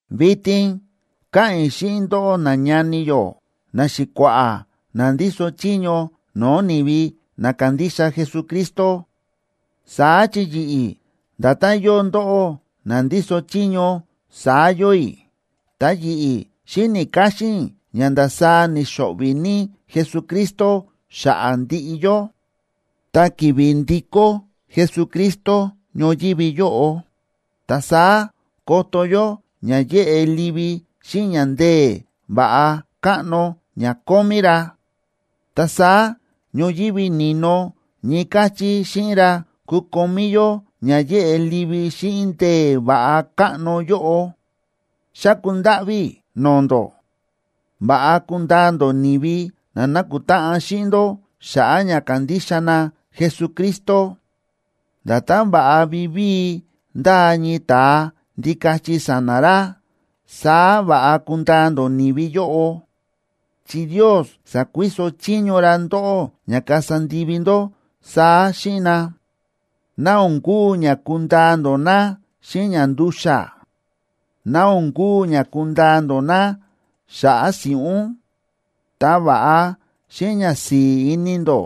Vitin káꞌa̱n i̱ xíꞌin ndóꞌó nañani yó, naxi̱kua̱ꞌa̱ na ndíso chiño no̱o̱ ni̱vi na kándixa Jesucristo, saá chi yi̱ꞌi̱, nda̱tán yóo ndóꞌó na ndíso chiño, saá yóo i̱. Ta yi̱ꞌi̱ xi̱ni̱ káxín i̱ ña ndasaá ni̱xo̱ꞌvi̱ ní Jesucristo xa̱ꞌa̱ ndiꞌi yó. Ta ki̱vi̱ ndikó Jesucristo ñoyívi yóꞌo, ta saá koto yó ña yéꞌe livi xíꞌin ña ndee̱ va̱ꞌa káꞌno ña kómí ra. Ta saá ñoyívi ni̱no ñii káchí xíꞌin ra kukomí yó ña yéꞌe livi xíꞌin ndee̱ va̱ꞌa káꞌno yóꞌo. Xáku ndáꞌví i̱ no̱o̱ ndó, va̱ꞌa kundaa ndó ni̱vi na nákutáꞌan xíꞌin ndó xa̱ꞌa̱ ña kándixa na Jesucristo. Nda̱tán va̱ꞌa vivíi ndáa ñii ta̱a ndikachi sa̱na̱ ra, saá va̱ꞌa kundaa ndó ni̱vi yóꞌo, chi Ndios sa̱kuiso chiño ra ndóꞌó ña kasa ndivi ndó saá xíꞌin na. Ná o̱n kuu ña kundaa ndó na xíꞌin ña ndu̱xa̱, ná o̱n kuu ña kundaa ndó na xa̱ꞌa̱ si̱ꞌún, ta va̱ꞌa xíꞌin ñasi̱i̱ ini ndó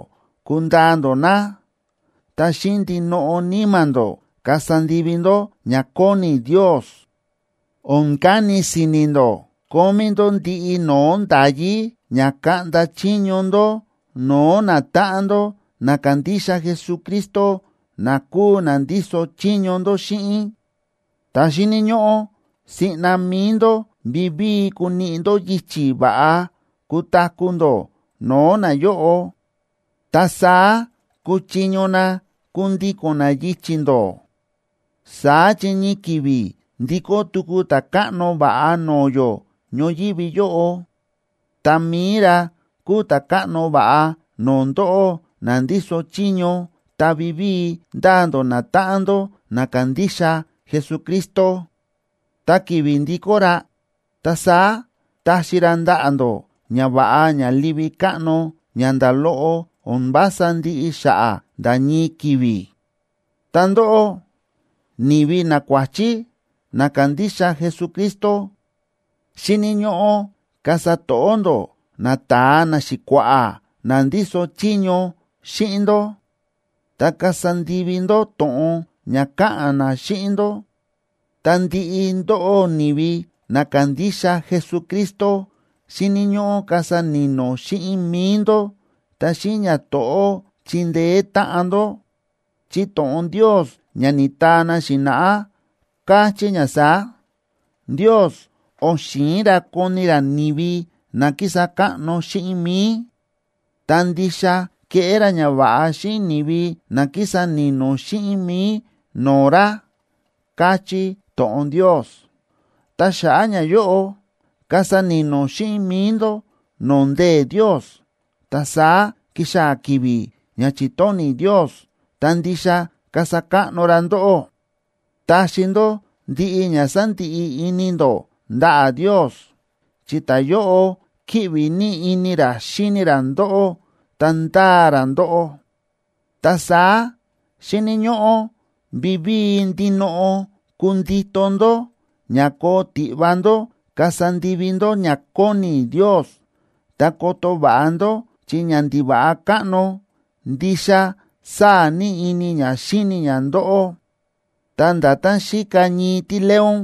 kundaa ndó na, ta xíꞌin ndinoꞌo níma̱ ndó kasa ndivi ndó ña kóni Ndios. O̱n kani si̱ni̱ ndó kómí ndó ndiꞌi no̱o̱ nda̱yí ña kaꞌnda chiño ndó no̱o̱ natáꞌan ndó na kándixa Jesucristo na kúu na ndíso chiño ndó xíꞌin. Ta xíni̱ ñóꞌó siꞌna mi̱i ndó vivíi kuniꞌi ndó yichi̱ va̱ꞌa kutaku̱ ndó no̱o̱ nayóꞌo, ta saá kuchiño na kundíko̱n na yichi̱ ndó. Saá chi ñii ki̱vi̱ ndikó tuku Ta̱káꞌno va̱ꞌa no̱o̱ yó ñoyívi yóꞌo. Ta mi̱i ra kúu Ta̱káꞌno va̱ꞌa no̱o̱ ndóꞌó na ndíso chiño ta vivíi ndáa ndó natáꞌan ndó na kándixa Jesucristo. Ta ki̱vi̱ ndikó ra, ta saá taxi ra ndaꞌa̱ ndó ñava̱ꞌa ña livi káꞌno ña nda̱ loꞌo o̱n vása ndiꞌi xa̱ꞌa̱ nda̱ ñii ki̱vi̱. Ta ndóꞌó ni̱vi nakuáchí na kándixa Jesucristo, xíni̱ ñóꞌó kasa to̱ꞌó ndó nata̱a naxi̱kua̱ꞌa̱ na ndíso chiño xíꞌin ndó, ta kasa ndivi ndó to̱ꞌon ña káꞌa̱n na xíꞌin ndó. Ta ndiꞌi ndóꞌó ni̱vi na kándixa Jesucristo, xíni̱ ñóꞌó kasa ni̱no̱ xíꞌin mi̱i ndó, ta xíꞌin ñato̱ꞌó chindeé táꞌan ndó, chi to̱ꞌon Ndios ña ni̱taa na xi̱na̱ꞌá, káchí ña saá: Ndios o̱n xi̱in ra koni ra ni̱vi na kísa káꞌno xíꞌin mi̱i, ta ndixa kéꞌé ra ñava̱ꞌa xíꞌin ni̱vi na kísa ni̱no̱ xíꞌin mi̱i no̱o̱ ra, káchí to̱ꞌon Ndios. Ta xa̱ꞌa̱ ñayóꞌo, kasa ni̱no̱ xíꞌin mi̱i ndó no̱o̱ ndee̱ Ndios, ta saá kixaa̱ ki̱vi̱ ña chi̱tóni̱ Ndios, ta ndixa kasa káꞌno ra ndóꞌó. Taxi ndó ndiꞌi ña sándiꞌi ini ndó ndaꞌa̱ Ndios, chi ta̱yóꞌo kíꞌvi ní ini ra xíni ra ndóꞌó ta ndáa ra ndóꞌó. Ta saá xíni̱ ñóꞌó vivíi ndinoꞌo kundito ndó ña koo tiꞌva ndó kasa ndivi ndó ña kóni Ndios, ta koto va̱ꞌa ndó chi ñandiva̱ꞌa káꞌno ndixa sáa̱ ní ini ña xíni ña ndóꞌó, ta nda̱tán xíka ñii tíleón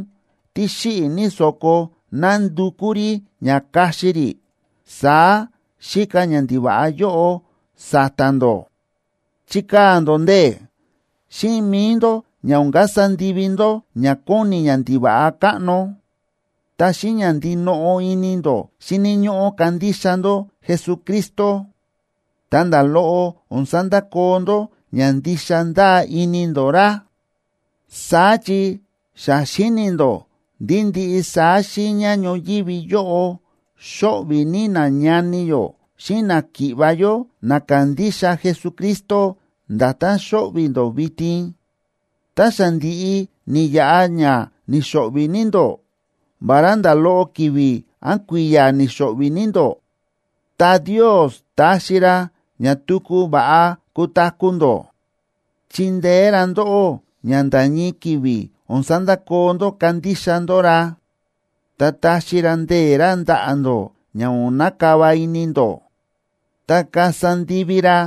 tí xíꞌi̱ ní so̱ko nándukú rí ña kaxi rí, saá xíka ñandiva̱ꞌa yóꞌo sa̱ta̱ ndó. Chikaa̱ ndó ndee̱ xíꞌin mi̱i ndó ña o̱n kasa ndivi ndó ña kóni ñandiva̱ꞌa káꞌno. Ta xíꞌin ña ndinoꞌo ini ndó xíni̱ ñóꞌó kandixa ndó Jesucristo ta nda̱ loꞌo o̱n sandakoo ndó ña ndixa ndáa ini ndó ra, saá chi xa xíni̱ ndó ndí ndiꞌi saá xiiña ñoyívi yóꞌo xóꞌvi̱ ní nañani yó xíꞌin náki̱ꞌva̱ yó na kándixa Jesucristo, nda̱tán xóꞌvi̱ ndó vitin. Tá xa ndi̱ꞌi ni̱yaꞌa ña ni̱xo̱ꞌvi̱ ní ndó, vará nda̱ loꞌo ki̱vi̱ án kui̱ya̱ ni̱xo̱ꞌvi̱ ní ndó, ta Ndios taxi ra ña tuku va̱ꞌa kutaku̱ ndó. Chindeé ra ndóꞌó ña nda̱ ñii ki̱vi̱ o̱n sandakoo ndó kándixa ndó ra, ta taxi ra ndee̱ ra ndaꞌa̱ ndó ña o̱n nakava ini ndó, ta kasa ndivi ra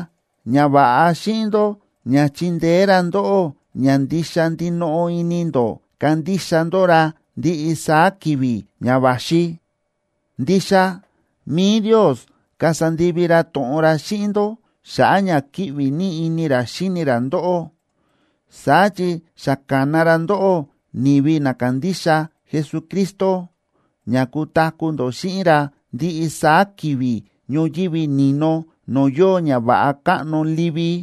ñava̱ꞌa xíꞌin ndó ña chindeé ra ndóꞌó ña ndixa ndinoꞌo ini ndó kandixa ndó ra ndiꞌi saá ki̱vi̱ ña va̱xi. Ndixa mi̱i Ndios kasa ndivi ra to̱ꞌon ra xíꞌin ndó xa̱ꞌa̱ ña kíꞌvi ní ini ra xíni ra ndóꞌó, saá chi xa ka̱na ra ndóꞌó ni̱vi na kándixa Jesucristo ña kutaku̱ ndó xíꞌin ra ndiꞌi saá ki̱vi̱ ñoyívi ni̱no no̱o̱ yóo ñava̱ꞌa káꞌno livi.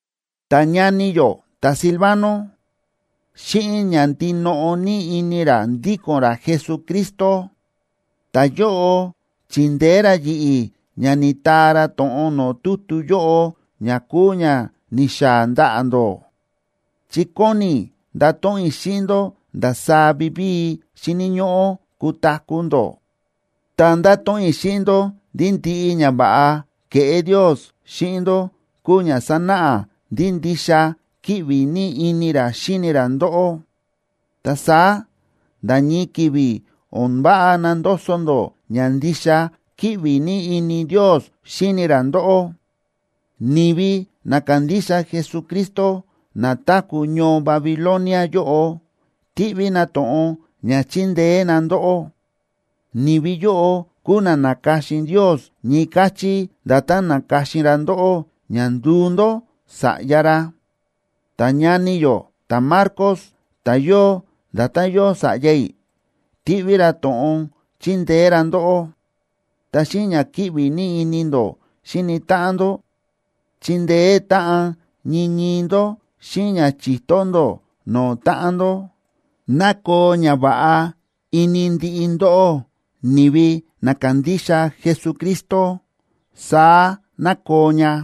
Ta ñani yó ta̱Silvano, xíꞌin ña ndinoꞌo ní ini ra ndíko̱n ra Jesucristo, ta̱yóꞌo chi̱ndeé ra yi̱ꞌi̱ ña ni̱taa ra to̱ꞌon no̱o̱ tutu yóꞌo ña kúu ña ni̱xaa̱ ndaꞌa̱ ndó, chi kóni i̱ ndato̱ꞌon i̱ xíꞌin ndó ndasaá vivíi xíni̱ ñóꞌó kutaku̱ ndó, ta nda̱to̱ꞌon i̱ xíꞌin ndó ndí ndiꞌi ñava̱ꞌa kéꞌé Ndios xíꞌin ndó kúu ña sánáꞌa ndí ndixa kíꞌvi ní ini ra xíni ra ndóꞌó. Ta saá nda̱ ñii ki̱vi̱ o̱n váꞌa nandoso ndó ña ndixa kíꞌvi ní ini Ndios xíni ra ndóꞌó. Ni̱vi na kándixa Jesucristo na táku̱ ñoo Babilonia yóꞌo, tíꞌví na to̱ꞌon ña chindeé na ndóꞌó. Ni̱vi yóꞌo kúu na na̱ka̱xin Ndios ñii káchí nda̱tán na̱ka̱xin ra ndóꞌó ña nduu ndó sa̱ꞌya ra. Ta ñani yó ta̱Marcos ta̱ yóo nda̱tán yóo sa̱ꞌya i̱, tíꞌví ra to̱ꞌon chindeé ra ndóꞌó. Ta xíꞌin ña kíꞌvi ní ini ndó xíni táꞌan ndó, chindeé táꞌan ñii ñii ndó xíꞌin ña chi̱to ndó no̱o̱ táꞌan ndó. Ná koo ñava̱ꞌa ini ndiꞌi ndóꞌó, ni̱vi na kándixa Jesucristo. Saá ná koo ña.